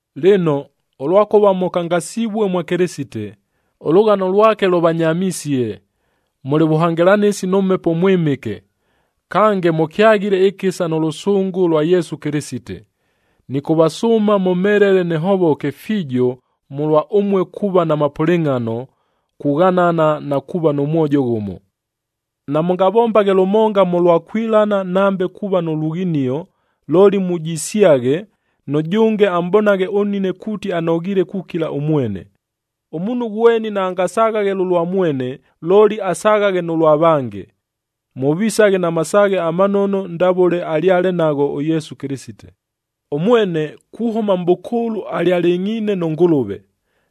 Lɨno, ʉlwakʉva mʉkangasivue mwa Kɨlɨsite, ʉlʉghano lwake lʉvanyamisie, mʉlɨ vʉhangɨlanɨsi nʉ Mhepo ʉMwɨmɨke, kange mʉkyaghile ɨkɨsa nʉ lʉsʉngʉ lwa Yesu Kɨlɨsite, nɨkʉvasʉʉma mʉmhelele nɨhovoke fiijo mʉlwa ʉmue kuuva na mapʉlɨngʼhano, kughanana na kuuva nʉ mwojo ghʉmo. Namʉngavombaghe lʉmonga mʉlwa kwilana nambe kuuva nʉ lughinio, looli mujisyaghe, nʉjʉnge amʼbonaghe ʉnnine kuuti anoghiile kukila ʉmwene. Ʉmuunhu ghweni naangasaghaghe lʉlwa mwene, looli asaghaghe nʉ lwa vange. Mʉvisaghe na masaaghe amanono ndavʉle alyale nagho ʉYesu Kɨlɨsite: Ʉmwene kuhʉma mʼbʉkʉʉlʉ alyalɨngʼhiine nʉ Ngʉlʉve.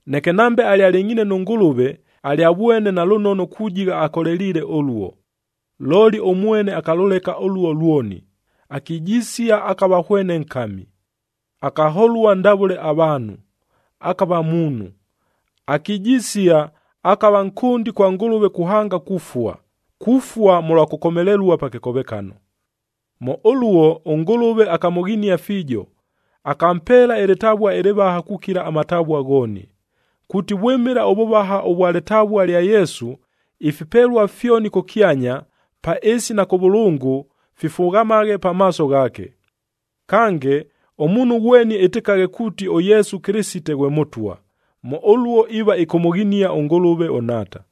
Neke nambe alyalɨngʼhiine nʉ Ngʉlʉve, alyavwene nalʉnono kujigha akoleliile ʉluo. Looli ʉmwene akalʉleka ʉluo lwoni, akijisia, akava hwene nkami. Akaholua ndavʉle avaanhu, akava muunhu. Akijisia, akava nkʉndi kwa Ngʉlʉve kuhanga kufua, kufua mʉlwa kʉkomelelua pa kɨkovekano! Mʉ ʉluo ʉNgʉlʉve akamʉghinia fiijo, akampeela ɨlɨtavua ɨlɨvaha kukila amatavua ghooni, kuuti vwɨmɨla ʉvʉvaha ʉvwa lɨtavua lya Yesu, ifipelua fyoni kʉkyanya, pa ɨɨsi na kʉvʉlʉngʉ,a fifughamaghe pamaaso ghaake. Kange, ʉmuunhu ghweni ɨtɨkaghe kuuti, ʉYesu Kɨlɨsite ghwe Mʉtwa. Mʉ ʉluo iiva ɨkʉmʉghinia ʉNgʉlʉve ʉNhaata.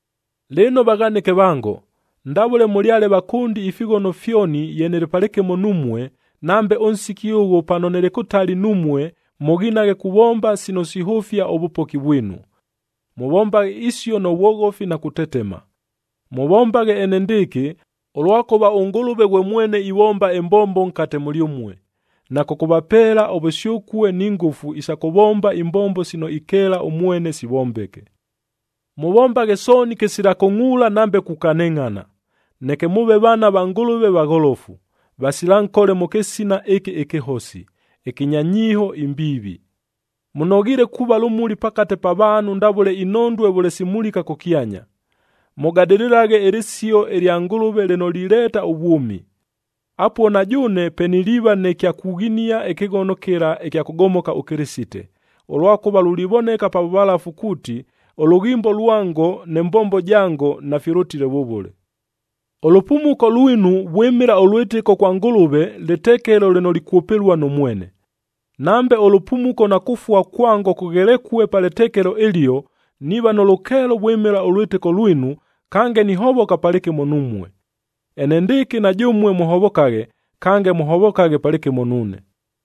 Lɨno vaghanɨke vango, ndavʉle mʉlyale vakʉndi ifighono fyoni ye nɨlɨ palɨkɨmo numue, nambe ʉnsiki ʉghʉ pano nɨlɨ kʉtali numue mʉghinaghe kuvomba sino sihʉfia ʉvʉpoki vwinu. Mʉvombaghe isio nʉ vwoghofi na kutetema. Mʉvombaghe enendɨɨkɨ, ʉlwakʉva ʉNgʉlʉve ghwe mwene ivomba ɨmbombo nkate mʉlyʉmue, na kʉkʉvapeela ʉvʉsyʉkue ni ngʉfu isa kʉvomba imbombo sino ikeela ʉmwene sivombeke. Mʉvombaghe sooni kɨsila kʉngʼuula nambe kukanɨngʼhana, neke mʉʉve vaana va Ngʉlʉve, vagholofu, vasila nkole mʉ kɨsina ɨkɨ ɨkɨhosi, ɨkɨnya nyiiho imbiivi. Mʉnoghiile kuuva lʉmuli pakate pa vaanhu ndavʉle inhondue vʉle simulika kʉkyanya. Mʉgadɨlɨlaghe ɨlɨsio ɨlya Ngʉlʉve lɨno lileeta ʉvwʉmi. Apuo na jʉʉne pe niliiva nɨ kya kughinia ɨkɨghono kɨla ɨkya kʉgomoka ʉKɨlɨsite, ʉlwakʉva lulivoneka pa vʉvalafu kuuti, ʉlʉghimbo lwango nɨ mbombo jango nafilʉtile vʉvʉle. Ʉlʉpumuko lwinu vwɨmɨla ʉlwɨtɨko kwa Ngʉlʉve lɨtekelo lɨno likwʉpɨlua nʉ mwene. Nambe ʉlʉpumuko na kufua kwango kʉghelekue pa lɨtekelo ɨlio, niiva nʉ lʉkeelo vwɨmɨla ʉlwɨtɨko lwinu, kange nihovoka palɨkɨmo numue. Enendɨɨkɨ na jʉmue mʉhovokaghe, kange mʉhovokaghe palɨkɨmo nuune.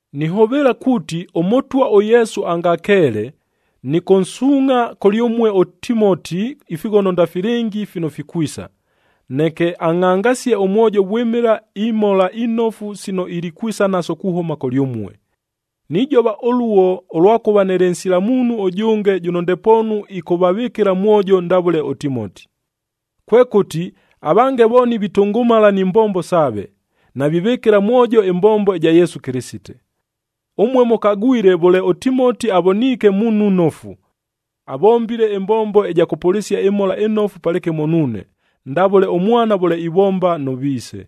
Nihʉvɨɨla kuuti ʉMʉtwa ʉYesu angakeele, nɨkʉnsuungʼha kʉlyʉmue ʉTimoti ifighono ndafilɨngi fino fikwisa, neke angʼhangasie ʉmwojo vwɨmɨla imhola inofu sino ilikwisa naso kuhʉma kʉlyʉmue. Nijova ʉluo, ʉlwakʉva nɨlɨ nsila muunhu ʉjʉnge jʉno ndepoonu ɨkʉvavɨkɨla mwojo ndavʉle ʉTimoti. Kwekʉti, avange vooni vitʉngʉmala ni mbombo saave, navivɨkɨla mwojo ɨmbombo ɨja Yesu Kɨlɨsite. Ʉmue mʉkagwile vʉle ʉTimoti avoniike muunhu nnofu. Avombile ɨmbombo ɨja kʉpʉlɨsia ɨMhola ɨNofu palɨkɨmo nuune, ndavʉle ʉmwana vʉle ivomba nʉ viise.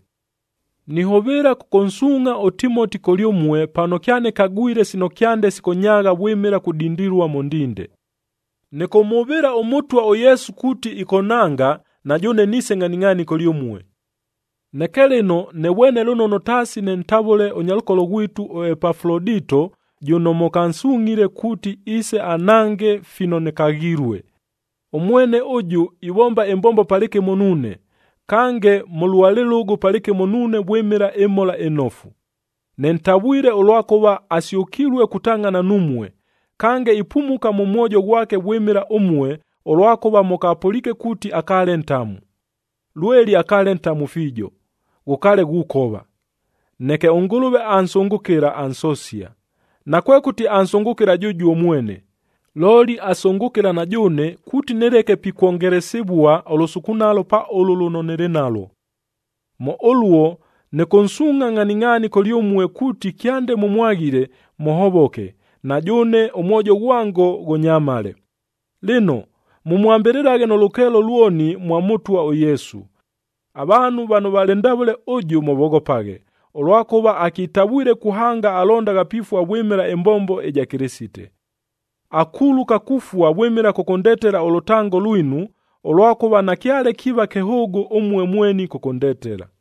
Nihʉvɨɨla kʉkʉnsuungʼha ʉTimoti kʉlyʉmue pano kyanɨkagwile sino kyande sikʉnyaagha vwɨmɨla kudindilua mʉ ndinde. Nɨkʉmhʉvɨɨla ʉMʉtwa ʉYesu kuuti ɨkʉnhanga, na jʉʉne niise ngʼhaningʼhaani kʉlyʉmue. Neke lɨno nɨvwene lʉnono taasi nɨntavʉle ʉnyalʉkolo ghwitu ʉEpafulodito jʉno mʉkansungʼhile kuuti iise anhange fino nɨkaghilue. Ʉmwene ʉjʉ ivomba ɨmbombo palɨkɨmo nuune, kange mʉlua lɨlʉgʉ palɨkɨmo nuune vwɨmɨla ɨMhola ɨNofu. Nɨntavwile ʉlwakʉva asyʉkilue kutangʼhana numue, kange ipumuka mʉ mwojo ghwake vwɨmɨla ʉmue, ʉlwakʉva mʉkapʉliike kuuti akaale ntamu. Lweli akaale ntamu fiijo, ghʉkaale ghukova, neke ʉNgʉlʉve ansʉngʉkɨla, ansosia. Nakwekʉti ansʉngʉkɨla jʉjuo mwene, looli asʉngʉkɨla na jʉʉne kuuti nɨleke pikwongelesivua ʉlʉsukunalo pa ʉlʉ lʉno nɨlɨ nalwo. Mʉ ʉluo nɨkʉnsuungʼha ngʼhaningʼhaani kʉlyʉmue kuuti kyande mʉmwaghile, mʉhovoke, na jʉʉne ʉmwojo ghwango ghʉnyamale. Lɨno, mʉmwambɨlɨlaghe nʉ lʉkeelo lwoni mwa Mʉtwa ʉYesu. Avaanhu vano valɨ ndavʉle ʉjʉ mʉvoghopaghe, ʉlwakʉva akitavwile kuhanga alondagha pifua vwɨmɨla ɨmbombo ɨja Kɨlɨsite. Akuluka kufua vwɨmɨla kʉkʉndetela ʉlʉtango lwinu, ʉlwakʉva nakyale kiiva kɨhʉʉgʉ ʉmue mweni kʉkʉndetela.